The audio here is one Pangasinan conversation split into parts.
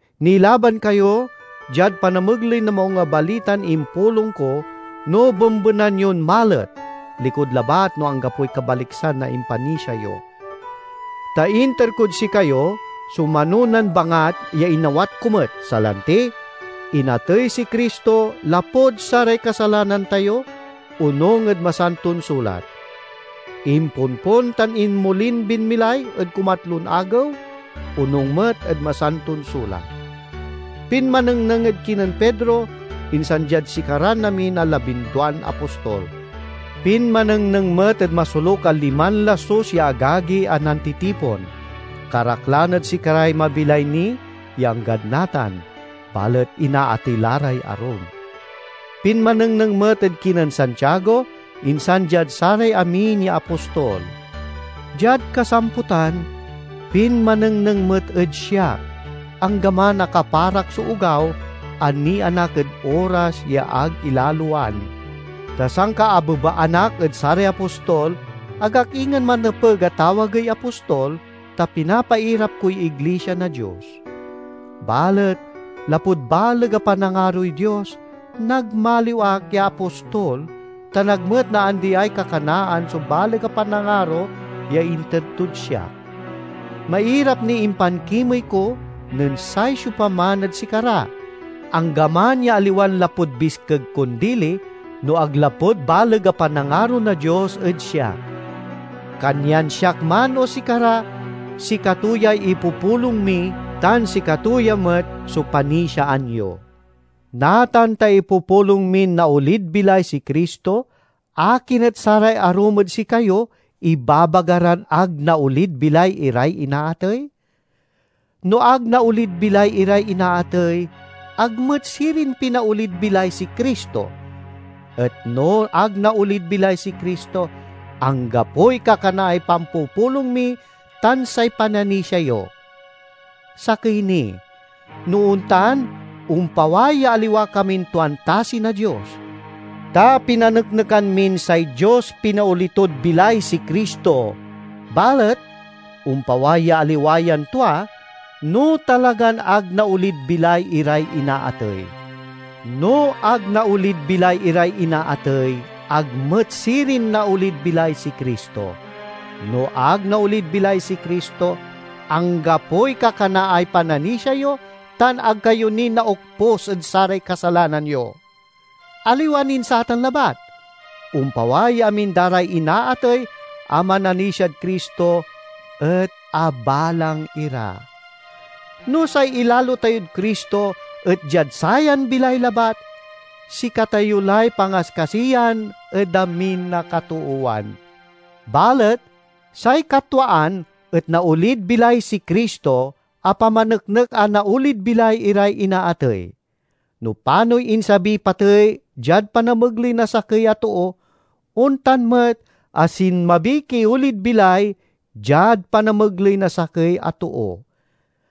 Nilaban kayo diad panamegley na Maung a Balitan impulong ko no bembenan yon malet–likud labat no anggapoy kabaliksan na impanisia yo. Ta inter kod sikayo so manonan bangat ya inawat ko met, salanti, inatey si Cristo lapud saray kasalanan tayo, onung ed Masanton Sulat; imponpon tan inmolin binmilay ed kumatlon agew, onung met ed Masanton Sulat; pinmanengneng ed kinen Pedro, insan diad sikaran amin a labinduan apostol. Pinmanengneng met ed masoluk a liman lasus ya agagi a nantitipon. Karaklan ed sikaray mabilay ni ya anggad natan, balet inaatey la ray arum. Pinmanengneng met ed kinen Santiago, insan diad saray amin ya apostol. Diad kasamputan, pinmanengneng met ed siak, anggaman a kaparak so ogaw a nianak ed oras ya ag ilaloan, ta sankaabebaan ak ed saray apostol, ag ak ingen manepeg a tawagey apostol, ta pinapairap koy iglisia na Dios. Balet lapud baleg a panangaroy Dios, nagmaliw ak ya apostol, tan ag met naandiay kakanaan so baleg a panangaro ya inter tod siak. Mairap niy impankimey ko nen say siopaman ed sikara, anggaman ya aliwan lapud biskeg kon dili, no ag lapud baleg a panangaro na Dios ed siak. Kanyan siak man o sikara, sikato yay ipupulong mi tan sikato ya met so panisiaan yo. Natan ta ipupulong min naolid bilay si Cristo, akin et saray arum ed sikayo ibabaga ran ag naolid bilay iray inaatey? No ag naolid bilay iray inaatey, ag met sirin pinaolid bilay si Cristo. Et no ag naolid bilay si Cristo, anggapoy kakanaay pampupulong mi tan say pananisia yo. Sakey ni no ontan, ompaway ya aliwa kamin tuan tasi na Dios. Ta pinaneknekan min say Dios pinaoli tod bilay si Cristo, balet ompaway ya aliwa yan tua no talagan ag naolid bilay iray inaatey. No ag naolid bilay iray inaatey, ag met sirin naolid bilay si Cristo. No ag naolid bilay si Cristo, anggapoy kakanaay pananisia yo tan ag kayo ni naokpus ed saray kasalanan yo. Aliwa nin satan labat, ompaway ya amin da ray inaatey a mananisiad Cristo et abalang ira. No say ilalo tayod Cristo et diad sayan bilay labat, sikatayo lay pangaskasiyan ed amin a katoowan. Balet say katwaan et naolid bilay si Cristo a pamaneknek a naolid bilay iray inaatey. No panoy insabiy patey diad panamegley na sakey a too, ontan met a sinmabiy kiolid bilay diad panamegley na sakey a too.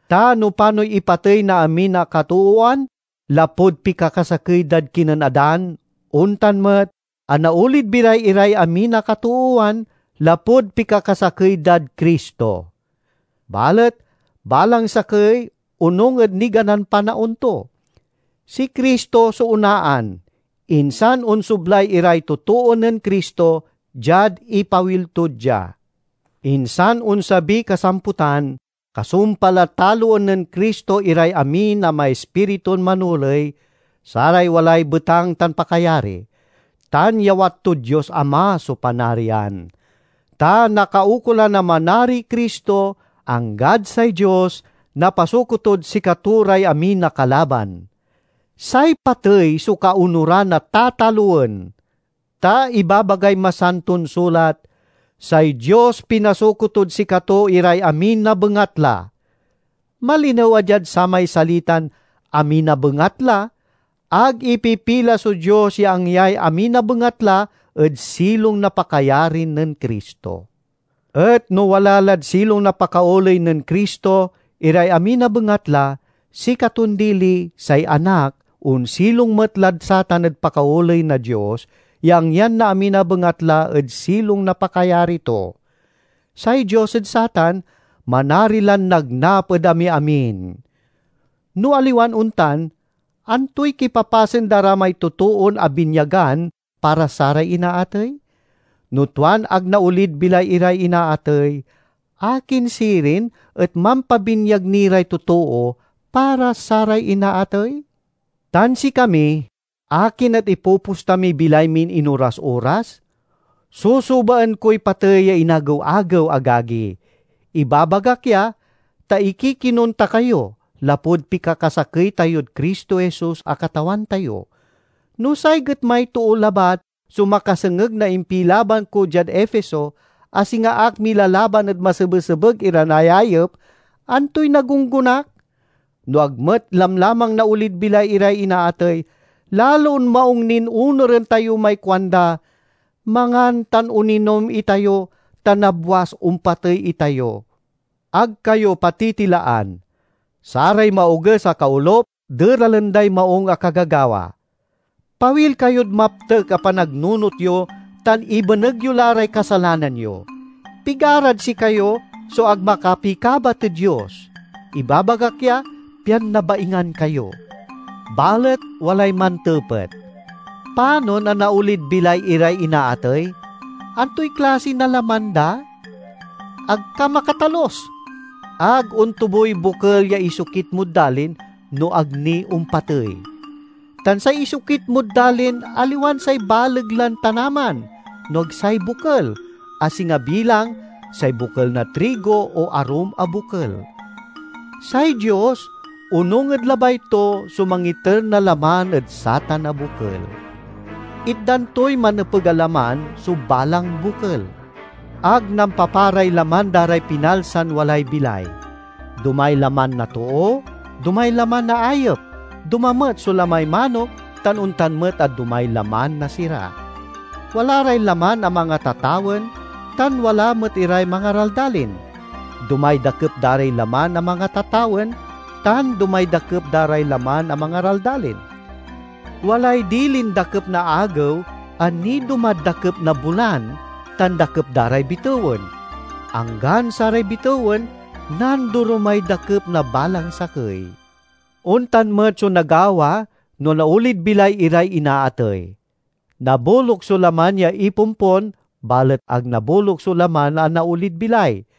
Ta no panoy ipatey na amin a katoowan lapud pikakasakey dad kinen Adan, ontan met a naolid bilay iray amin a katoowan lapud pikakasakey dad Cristo. Balet balang sakey onung ed niganan panaon to: si Cristo so onaan, insan onsoblay iray totoo nen Cristo, diad ipawil to dia. Insan onsabiy kasamputan, kasumpal a taloen nen Cristo iray amin a maispiritun manoley, saray walay betang tan pakayari; tan yawat tod Dios Ama so Panarian. Ta nakaukolan a manariy Cristo, anggad say Dios napasuko tod sikato ray amin a kalaban. Say patey so kaonuran a tatalowen. Ta ibabagay Masanton Sulat, "Say Dios pinasuko tod sikato iray amin a bengatla." Malinew a diad samay salitan "amin a bengatla", ag ipipila so Dios ya angyay amin a bengatla ed silong na pakayari nen Cristo. Et no wala lad silong na pakaoley nen Cristo iray amin a bengatla, sikaton dili, say Anak, onsilong met lad satan ed pakaoley na Dios ya angyan na amin a bengatla ed silong na pakayari to. Say Dios ed satan manari lan nagnap ed amiamin. No aliwan ontan, antoy kipapasen da ra may totoon abinyagan para saray inaatey? No tuan ag naolid bilay iray inaatey, akin sirin et mampabinyag ni ray totoo para saray inaatey? Tan sikami–akin et ipoposta miy bilay min inoras-oras? Susubaen koy patey ya inagew-agew, agagi! Ibabagak ya, ta ikikinon ta kayo, lapud pikakasakey tayod Cristo Jesus a Katawan tayo! No say getmay too labat so makasengeg na impilaban ko diad Efeso, a singa ak milalaban ed masebesebeg iran ayayep, antoy nagunggonak? No ag met lamlamang naolid bilay iray inaatey, lalon maung nin onuren tayo may kuanda, "Mangan tan oninom itayo, ta nabwas ompatey itayo." Ag kayo patitilaan. "Saray maoges a kaolup deralen day maung a kagagawa." Pawil kayod maptek a panagnunot yo tan ibeneg yo la ray kasalanan yo. Pigarad sikayo so ag makapikabat ed Dios; ibabagak ya, pian nabaingan kayo. Balet walay mantepet, "Panon a naolid bilay iray inaatey? Antoy klasi na laman da?" Ag ka makatalus! Ag ontuboy bokel ya isokit mod dalin, no ag ni ompatey. Tan say isokit mod dalin aliwan say baleg lan tanaman, no ag say bokel, a singa bilang say bokel na trigo o arum a bokel. Say Dios, onung ed labay to, so mangiter na laman ed satan a bokel. Itdan toy manepeg a laman so balang bokel. Ag nampaparay laman da ray pinalsan walay bilay; domay laman na too, domay laman na ayep, doma met so lamay manok, tan ontan met a domay laman na sira. Wala ray laman a mangatatawen, tan wala met iray mangaraldalin. Domay dakep da ray laman a mangatatawen, tan domay dakep da ray laman a mangaraldalin. Walay dilin dakep na agew a nidomad dakep na bulan tan dakep da ray bitewen. Anggan saray bitewen, nandoromay dakep na balang sakey. Ontan met so nagawa no naolid bilay iray inaatey. Naboluk so laman ya ipompon, balet ag naboluk so laman a naolid bilay.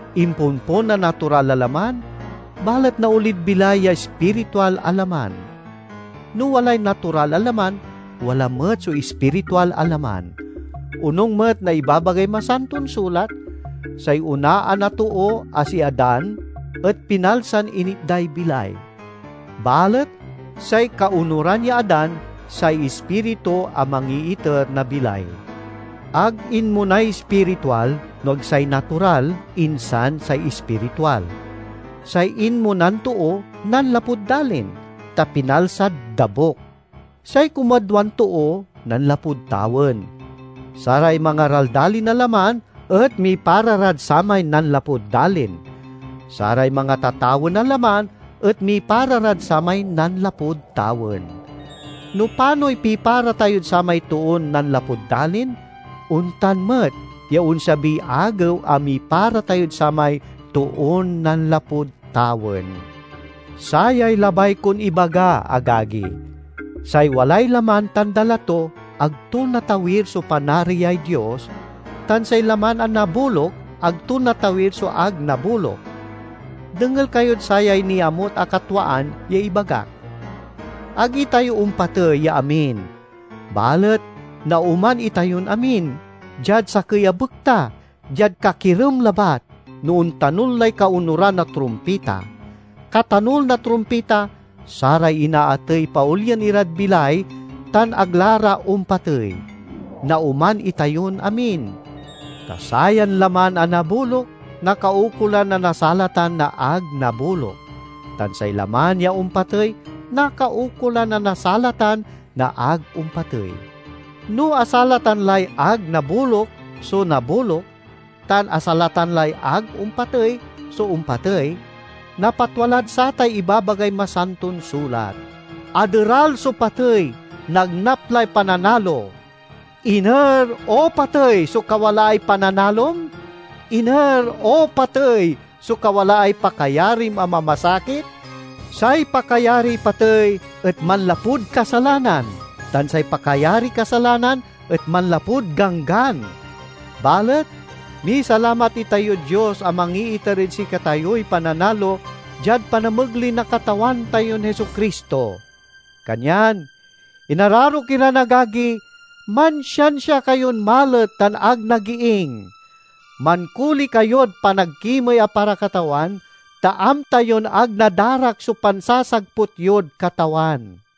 Imponpon a natural a laman, balet naolid bilay ya ispiritual a laman. No walay natural a laman, wala met so ispiritual a laman. Onung met na ibabagay Masanton Sulat, "Say onaan a too a si Adan et pinalsan initday bilay"; balet say kaonuran ya Adan say Ispiritu a mangiiter na bilay. Ag inmonay ispiritual, no ag say natural, insan say ispiritual. Say inmonan too, nanlapud dalin, ta pinalsad dabuk; say kumadwan too nanlapud tawen. Saray mangaraldalin a laman et mipara rad samay nanlapud dalin; saray mangatatawen a laman, et mipara rad samay nanlapud tawen. No panoy pipara tayod samay toon nanlapud dalin, ontan met ya onsabiy agew a mipara tayod samay Toon nanlapud tawen. Sayay labay kon ibaga, agagi: say walay laman tan dala to, ag to natawir so Panariay Dios, tan say laman a naboluk, ag to natawir so ag naboluk. Dengel kayod sayay niamut a katwaan ya ibagak: ag itayo ompatey ya amin, balet naoman itayon amin, diad sakey a bekta, diad kakirem labat, no ontanul lay kaonuran a trumpita. Katanul na trumpita, saray inaatey paolien irad bilay tan ag la ra ompatey. Naoman itayon amin, ta sayan laman a naboluk, nakaukolan a nasalatan na ag naboluk; tan say laman ya ompatey, nakaukolan a nasalatan na ag ompatey. No asalatan lay ag naboluk so naboluk tan asalatan lay ag ompatey so ompatey, napatwa lad satay ibabagay Masanton Sulat: "Aderal so Patey, nagnap lay pananalo!" "Iner, O Patey, so kawalaay pananalom? Iner, O Patey, so kawalaay pakayarim a mamasakit?" Say pakayariy patey et manlapud kasalanan, tan say pakayariy kasalanan et manlapud Ganggan. Balet misalamat itayod Dios a mangiiter ed sikatayoy pananalo diad panamegley na Katawan tayon Jesu-Cristo! Kanyan, inararok iran agagi, mansiansia kayon malet tan ag nagiing. Mankoli kayod panagkimey a para Katawan, ta amta yon ag nadarak so pansasagput yod Katawan.